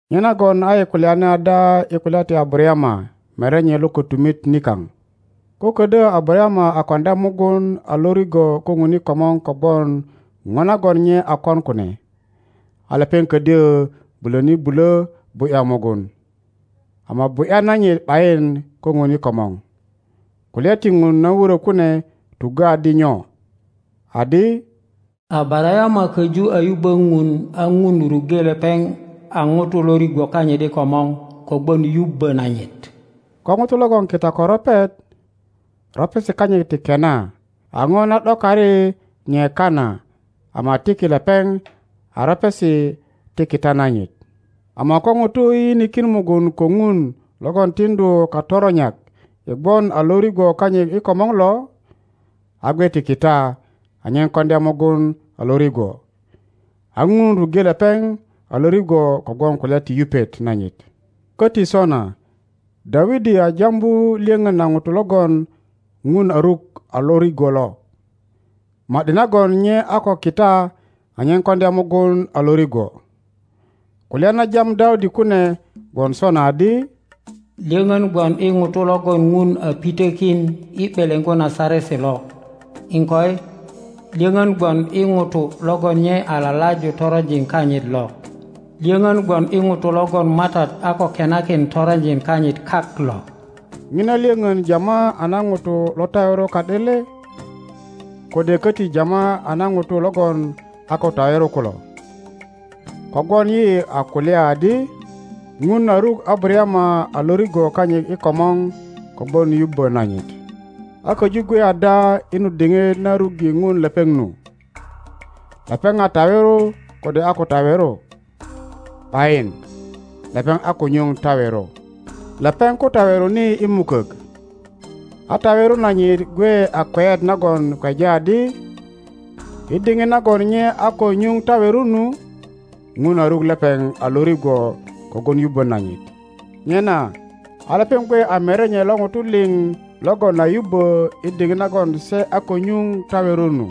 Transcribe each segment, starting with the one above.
Nyenagon a yi kulyani ada i kulya ti Abarayama merenye lo kötumit nikaŋ? Ko ködyö Abarayama a koŋdya mugun a lo rigwo ko Ŋun i komor kogwon ŋo nagon nye a kon kune, a lepeŋ ködyö bulöni bulö bu ’ya mugun, ama bu ’ya nanyit ’bayin ko Ŋun i komor. Kulya ti Ŋun na wurö kune tuggö adi nyo? Adi, Abarayama köju a yubbö Ŋun a Ŋun ruŋge lepeŋ a ŋuto lo rigwo kanyit i komor kogwon yubbö nanyit. Ko ŋuto logon kita ko ropet, ropesi kanyit ti kena a ŋo na ’dokari nye kana ama tiki lepeŋ a ropesi ti kita nanyit. Ama ko ŋuto yiyinikin mugun ko Ŋun logon tiŋdu katoronyak i gwon a lo rigwo kanyit i komor lo, a gwe ti kita anyen koŋdya mugun a lo rigwo, a Ŋun ruŋge lepeŋ a lo rigwo kogwon kulya ti yupet nanyit. Köti sona Dawidi a jambu lyöŋön na ŋuto logon Ŋun a ruk a lo rigwo lo, ma ’di nagon nye a ko kita anyen koŋdya mugun a lo rigwo. Kulya na jam Dawidi kune gwon sona adi, Lyöŋön gwon i ŋuto logon Ŋun a pitökin i ’beleŋgu na saresi lo, iŋkoi, lyöŋön gwon i ŋuto logon nye a lalaju toronjin kanyit lo. Lyöŋön gwon i ŋuto logon Matat a ko kenakin toronjin kanyit kak lo. Ŋina lyöŋön jama a na ŋutu lo tawero ka ’de le, kode köti jama a na ŋutu logon a ko tawero kulo? Kogwon yi a kulya adi, Ŋun a ruk Abarayama a lo rigwo kanyit i komor kogwon yubbö nanyit. A köju gwe ada i nu diŋit na ruŋge Ŋun lepeŋ nu? Lepeŋ a tawero kode a ko tawero? ’Bayin, lepeŋ a ko nyuŋ tawero. Lepeŋ ko taweroni i mukök, a tawero nanyit gwe a kweyet nagon kweja adi, i diŋit nagon nye a ko nyuŋ tawero nu, Ŋun a ruk lepeŋ a lo rigwo kogwon yubbo nanyit. Nyena a lepeŋ gwe a merenye lo ŋutu liŋ logon a yubbö i diŋit nagon se a ko nyuŋ tawero nu,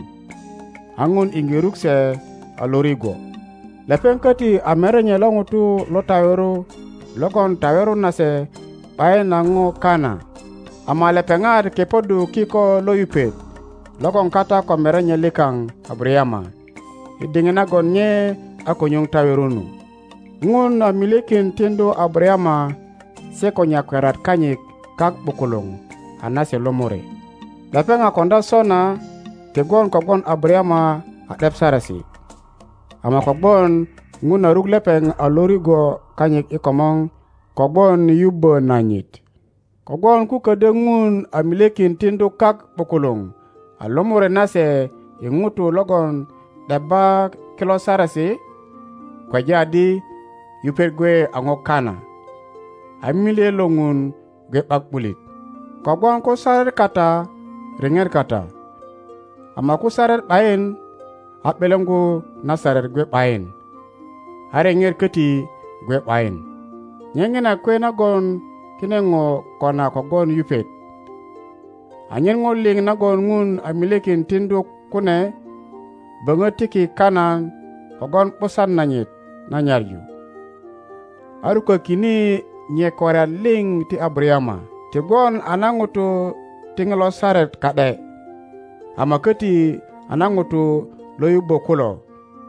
a Ŋun iŋge ruk se a lo rigwo. Lepeŋ köti a merenye lo ŋutu lo tawero logon tawero nase ’bayin a ŋo kana, ama lepeŋat kepoddu kiko lo yupet logon kata ko merenye likaŋ Abarayama i diŋit nagon nye a ko nyuŋ tawero nu. Ŋun a milyekin tiŋdu Abarayama se ko nyakwariat kanyit kak ’bukuluŋ a nase lomore; lepeŋ a koŋdya sona ti gwon kogwon Abarayama a ’dep saresi, ama kogwon Ŋun a ruk lepeŋ a lo rigwo kanyit i komor kogwon yubbö nanyit. Kogwon ko ködyö Ŋun a milyekin tiŋdu kak ’bukuluŋ a lomore nase i ŋutu logon ’debba kilo saresi, kweja adi yupet gwe a ŋo kana a milye lo Ŋun gwe ’bak ’bulit. Kogwon ko saret kata riŋet kata, ama ko saret ’bayin, a ’beleŋgu na saret gwe ’bayin, a riŋet koti gwe ’bayin. Nye ŋina kwe nagon kine ŋo kona kogwon yupet, anyen ŋo liŋ nagon Ŋun a milyekin tiŋdu kune böŋö tiki kana kogwon ’busan nanyit na nyaŋu, a rukökine nyakwariat liŋ ti Abarayama, ti gwon a na ŋutu ti ŋilo Saret ka ’de, ama köti a na ŋutu lo yubbo kulo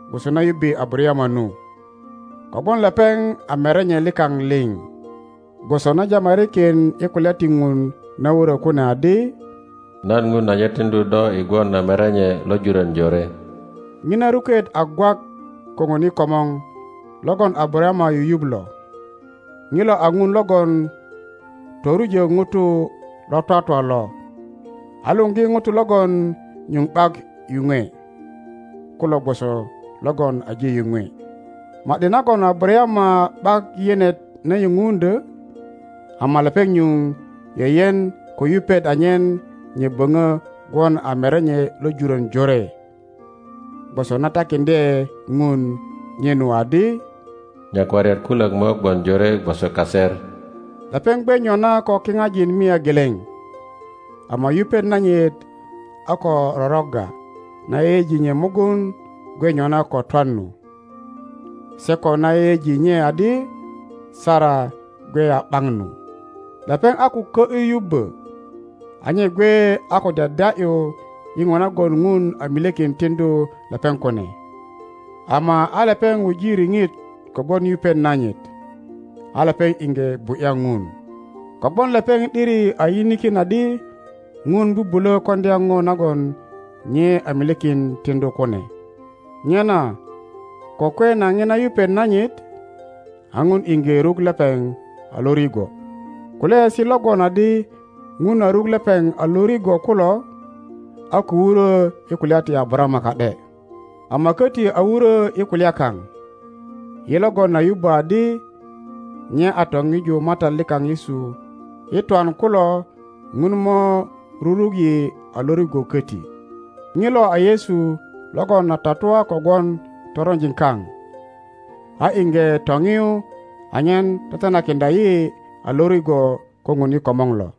gwoso na yubbe Abarayama nu, kogwon lepeŋ a merenye likaŋ liŋ, gwoso na jamarikin i kulya ti Ŋun na wurö kune adi, Nan Ŋun aje tiŋdu do i gwon a merenye lo jurön jore.Ŋina ruket a gwak ko Ŋun i komor logon Abarayama yuyuŋ lo, ŋilo a Ŋun logon torujö ŋutu lo twatwa lo, a luŋgi ŋutu logon nyuŋ ’bak yuŋwe kulo gwoso logon aje yuŋwe. Ma ’di nagon Abarayama ’bak yenet na yuŋ undyö ama lepeŋ nyuŋ yeyen ko yuyuŋ anyen nye böŋö gwon a merenye lo jurön jore, gwoso na takiŋdye Ŋun nye nu adi, Nyakwariat kulök mo gwon jore gwoso kaser. Lepeŋ gwe nyona ko kiŋajin mia geleŋ, ama yupet nanyit a ko rorogga na yeyeji nye mugun gwe nyona ko twan nu, se ko na yeyeji nye adi Sara gwe a ’baŋ nu. Lepeŋ a ko kö ’yu yubbö, a nye gwe a ko dyadya ’yu i ŋo nagon Ŋun a milyekin tiŋdu lepeŋ kune, ama a lepeŋ wuji riŋit kogwon yupet nanyit, a lepeŋ iŋge bu ’ya Ŋun; kogwon lepeŋ ’diri a yinikin adi Ŋun bubulö koŋdya ŋo nagon nye a milyekin tiŋdu kune. Nyena ko kwe na ŋina yupet nanyit, a Ŋun iŋge ruk lepeŋ a lo rigwo. Kulyaesi logon adi Ŋun a ruk lepeŋ a lo rigwo kulo, a ko wurö i kulya ti Abarayama ka ’de, ama köti a wurö i kulya kaŋ. Yi logon a yubbö adi nye a toŋiju Matat likaŋ Yesu i twan kulo Ŋun mo ruruk yi a lo rigwo köti. Ŋilo a Yesu logon a tatua kogwon toronjin kaŋ, a iŋge toŋiyu anyen tetenayeiŋdya yi a lo rigwo ko Ŋun i komor lo.